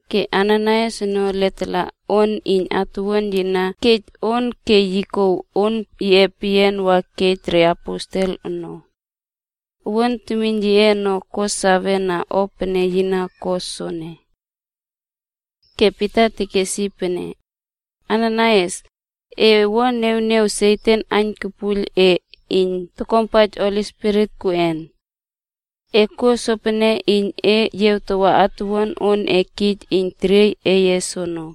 Ke Ananaias ono letala on iyn atuwuan yi na kej ono ke yi kouw on yiꞌe peyian wa kej reaposel ono. Owuan temiyn yiꞌe ono ko sawena o pene yi na ko soene. Ke Pita tekes yi pene, “Ananaias, e wua niawniaw Satan aiynwuiylpuiylna e iyn tokuampaij Holi Spirit kuꞌen? E kuo sopene iyn e yiawtawa atuwuan on e kij iyn teriey eye soono.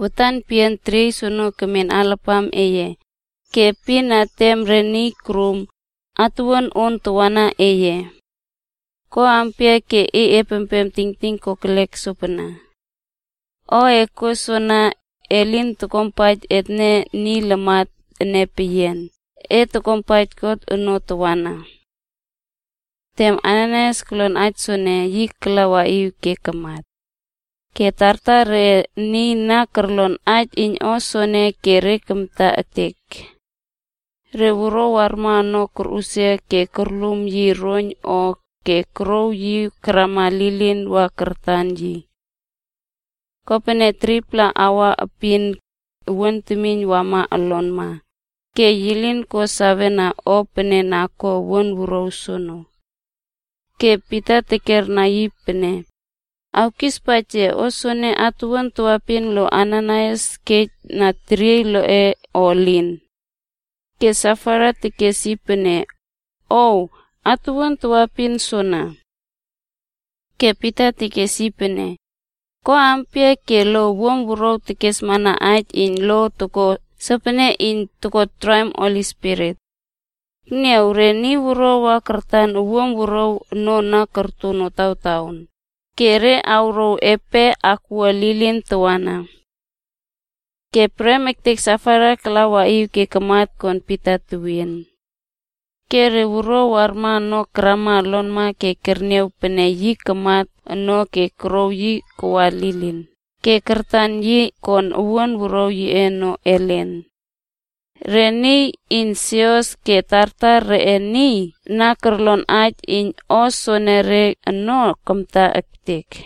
Watan peyian teriey soono kemen alapam eye, ke epin na tem re niy korum, atuwuan ono tawana eye. Ko ampia ke e keꞌiep tingting kokelek sopana? O e kuo soana, elin kopene e tokuampaij etne niy lamat ene peyian, e tokuampaij God ono tawana.” Tem Ananaias kolon aij soene, yi kala waꞌiw ke kamat. Ke tartar reꞌe niy na korlon aij iyn o soene ke re kamta ektek. Re wuruaw warma ono korꞌusia ke korlum yi roiyn o, ke korouw yi karwa lilin wa kartan yi. Kopene 3-pla aua epin, owuan temiyn wama olonma, ke yi lin ko sawena o pene na ko owuan wuruaw soono. Ke Pita tekerna yi pene, “Awkispaij yia, soene atuwuan tawaepin lo Ananaias kej na teriey loꞌe o elin?” Ke Safaira tekes yi pene, “Ow, atuwuan tawaepin soana.” Ke Pita tekes yi pene, “Ko ampia ke lo owuam wuruaw kesmana aij iyn lo ko sopene iyn ko traim Spirit iyn Niy Prum? Ekniaw, re niy wuruaw wa kartan owuam wuruaw ono na korto notawtaon, ke re awrouw epe akwua lilin tawana.” Ke prem ektek Safaira kala waꞌiw ke kamat kon Pita tewien. Ke re wuruaw warma ono karama olonma ke kerniaw pene yi kamat ono ke korouw yi kawa lilin ke kartan yi kon owuan wuruaw yiꞌe ono ellen. Re niy iyn sios ke tartar reꞌe niy na korlon aij iyn o soenere ono kamta ektek.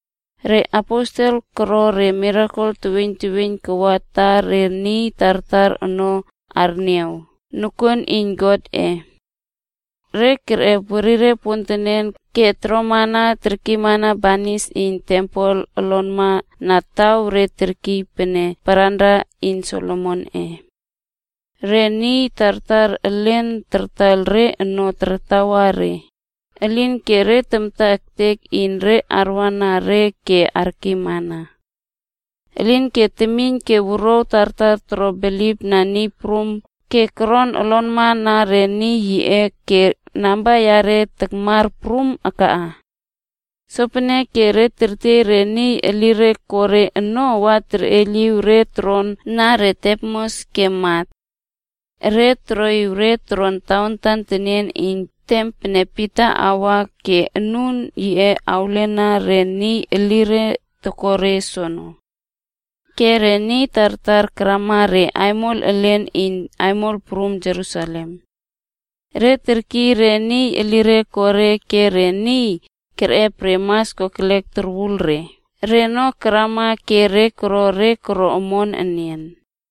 Re aposel koro re mirakel teweiyn teweiyn kawa ta re niy tartar ono arniaw nokuon iyn Godꞌe. Re kerꞌep werire pontenen ke toroma terkiymana banis iyn tempel olonma na taw re terkiy pene paranra iyn Solomonꞌe. Re niy tartar elin tartaiyl re ono tartawa re, elinke re tamta ektek iyn re arwana re ke arkiymana. Elinke temiyn ke wuruaw tartar koro bilipna Niy Prum ke koron olonma na re niy yiꞌe ke namba yare takmar prum akaꞌa. Sopeneke re tertiey re niy elire ko re ono wa toroꞌiw re toron na re tepnos ke mat. Re toroꞌiw re toron tawantan tenien iyn tem pene Pita awa ke anun yiꞌe awlena re niy elire tokore soono. Ke re niy tartar karama re aimol elen iyn aimol prum Jerusalem. Re kertiey re niy elire ko re ke re niy kerꞌep re mas kokelek torwul re ono karama ke re koro re koro omon enian.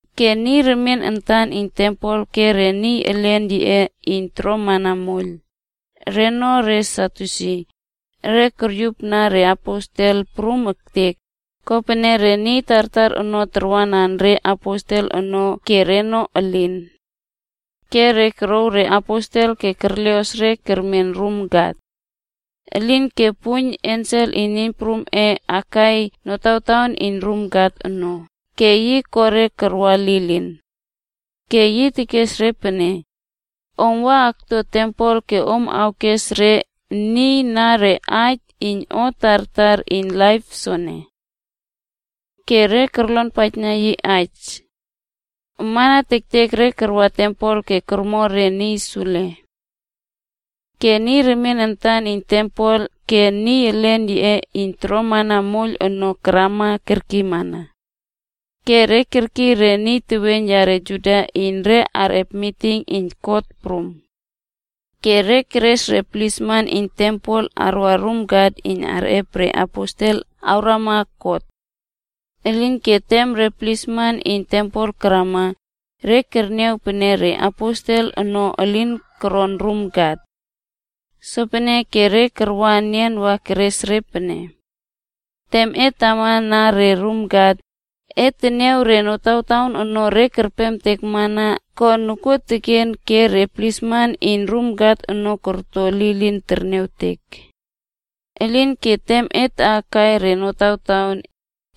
Ke niy remien antan iyn tempel ke re niy elen yiꞌe iyn toromana moiyl, (reno re Sadyusi), re koryupna re aposel prum ektek, kopene re niy tartar ono tarwana re aposel ono ke reno elin. Ke re korow re aposel ke kerleꞌos re kermen rum kat. Elinke puiyn ensel iyn Niy Prumꞌe akai notawtaon iyn rum kat ono ke yi koꞌo re karwa lilin. Ke yi tekes re pene, “Om wa akto tempel ke om awkes re niy na re aij iyn o tartar iyn laip soene.” Ke re korlonpaijna yi aij. Amana tektek re karwa tempel ke kormo re niy sule. Ke niy remien antan iyn tempel ke niy elen yiꞌe iyn toromana moiyl ono karama kerkiymana. Ke re kerkiy re niy teweiyn yare Juda iyn re arꞌep miting iyn kot prum. Ke re keres re plisman iyn tempel karwa rum kat iyn arꞌep re aposel awrama kot. Elinke tem re plisman iyn tempel karama, re kerniaw pene re aposel ono elin koron rum kat. Sopeneke re karwa enian wa keres re pene, “Tem et tama na re rum kat, et teniaw re notawtaon ono re kerpemtekna ko nokuon ke re plisman iyn rum kat ono korto lilin terniawtek. Elinke tem et taꞌakai re notawtaon,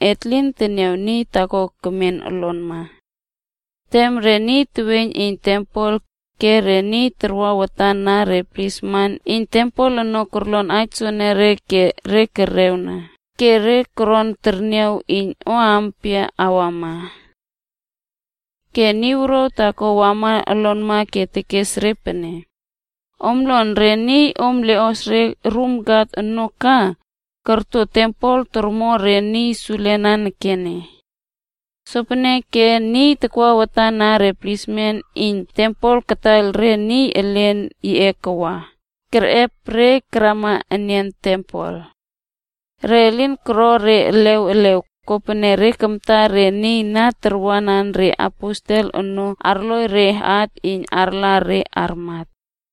et lin teniaw niy taako kemen olonma.” Tem re niy remien teweiyn iyn tempel, ke niy takwa watan na re plisman iyn tempel ono korlon re aij soenere ke re terewna, ke re toron terniaw iyn o ampia enian awama. Ke niy wuruaw taako wama olonma ke yi tekes re pene, “Om lon, re niy om leꞌos re rum kat ono ka, korto tempel tormo re niy sule nanekene.” Sopeneke niy takwa watan na re plisman iyn tempel kataiyl re niy elen yiꞌe karwa kerꞌep re karama enian (tempel). Re lin koro re elew elew, kopene re kamta re niy na tarwanan re aposel ono arloi re at iyn arla re armat.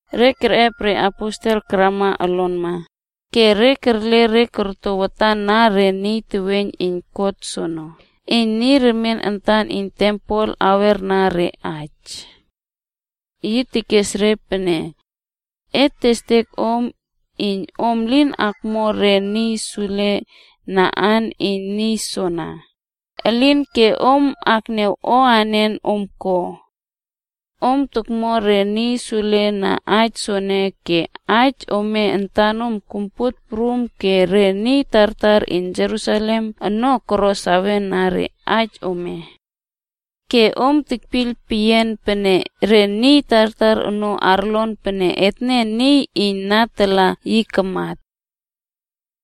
Re kerꞌep re aposel karama olonma, ke re kerle re korto watan na re niy teweiyn iyn kot soono iyn niy remien antan iyn tempel awerna re aij. Yi tekes re pene, “Et testek om iyn om lin akmo re niy sule na aan iyn niy soana, elinke om akniaw o anen om ko! Om tokmo re niy sule na aij soene ke aij ome ana kompuot prum ke re niy tartar iyn aimol prum Jerusalem ono koro sawena re aij ome. Ke om tekpiyl peyian pene re niy tartar ono arlon pene etne niy iyn na tala yi kamat.”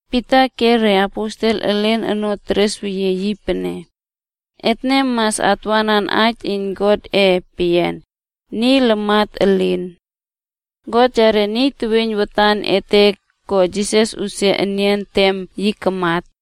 Pita ke re aposel elen ono teresweyie re pene, “Etne mas atwanan aij iyn Godꞌe peyian, niy lamatꞌe elin! God yare niy teweiyn watan ete ko Jisas usia enian tem yi kamat.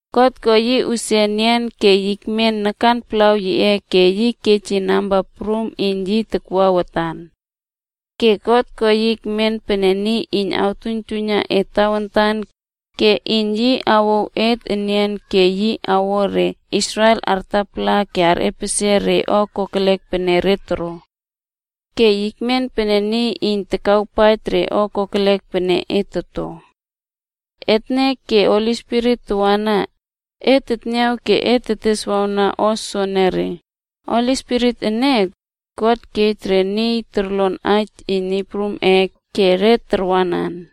God ko yi usia ke yi ekmen nakan palaw yiꞌe ke yi kej yi namba prum iyn yi takwa watan. Ke God ko yi ekmen pene niy iyn awtuiyntuiyna et tawantan ke iyn yi awouw et enian ke yi awo re Israel artapala ke arꞌepesie re o kokelek pene re toro. Ke yi ekmen pene niy iyn takawpaij re o kokelek pene et toto. Etne ke Holi Spirit tawana, et teniaw ke et teteswawna o soenere. Holi Spirit ene, God kej re niy korlon aij iyn Niy Prumꞌe ke re tarwanan.”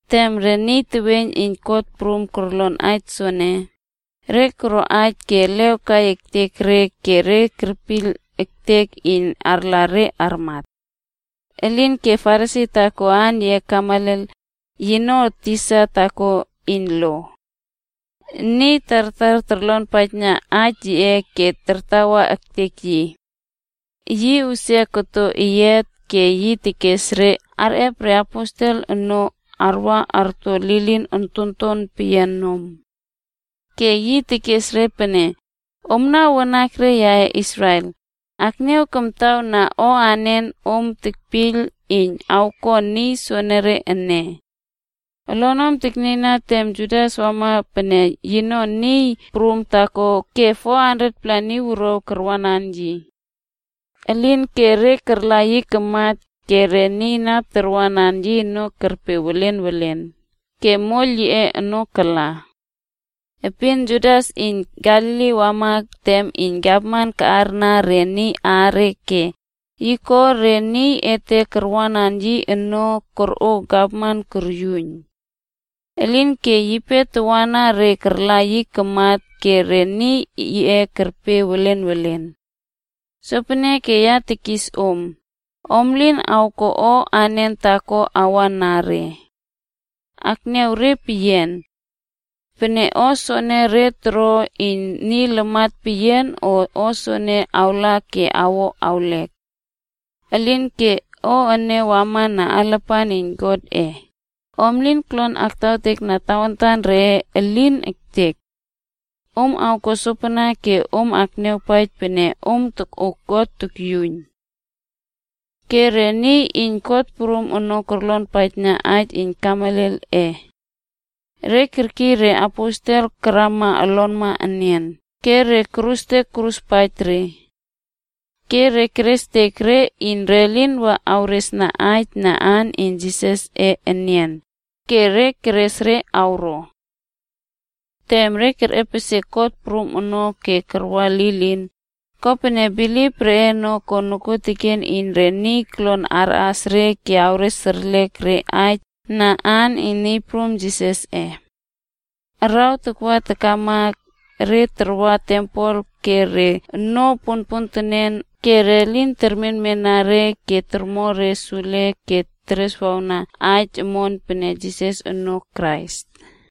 Tem re niy teweiyn iyn kot prum korlon aij soene, re koro aij ke elew kai ektek re ke kerpiyl ektek iyn arla re armat. Elinke Farisi taako aan yiꞌe Gamaliel, yino tisa taako iyn lo. Niy tartar torlonpaij aij yiꞌe ke tartawa ektek yi. Yi usia koto ke yi kes aij iyn re arꞌep re aposel ono arwa arto lilin ontonton peyian nom. Ke yi tekes re pene, “Omna wanakre yaꞌe Israel, akniaw kamtaw na o anen om tekpiyl iyn awko niy soenere ene. Olonom aknieiyna tem Teudas wama pene yino niy prum taako ke 400-pla niy wuruaw karwanan yi. Elinke re karla yi kamat, ke niy na karwanan yi ono kerpe welen welen, ke moiyl yiꞌe ono kala. Epin Judas iyn Galili wama tem iyn gavman kaꞌarna re niy aare ke yi koꞌo re niy ete karwanan yi ono korꞌo gavman koryuiyn. Elinke yipe tawana re karla yi kamat ke re niy yiꞌe kerpe welen welen. Sopeneke ya tekis om, om lin awko o anen taako awa na re. Akniaw re peyian. Pene o soene re toro iyn niy lamat peyian, o soene awla ke awo awlek. Elinke pene o ene wamana alapan iyn Godꞌe, om lin kolon aktawtekna tawantan reꞌe, elin ektek! Om awko sopana ke om akniawpaij pene om tokꞌo God tokyuiyn.” Ke re niy iyn kot prum ono korlonpaijna aij iyn Gamalielꞌe. Re kerkiy re aposel karwa olonma enian, ke re korustek koruspaij re. Ke re kerestek re iyn re lin wa awresna aij na aan iyn Jisasꞌe enian, ke re keres re karwa. Tem re kerꞌepesie kot prum ono ke karwa lilin, kopene God niawpaij pene bilip reꞌe ko nokuoteken iyn re niy kolon arꞌas re ke awres erlek re aij na aan iyn Niy Prum Jisasꞌe. Araw takwa takama, re tarwa tempel ke re onoo ponpontenen ke re lin termenmena re iyn tormo re sule ke tereswawna aij omon pene Jisas ono Krais.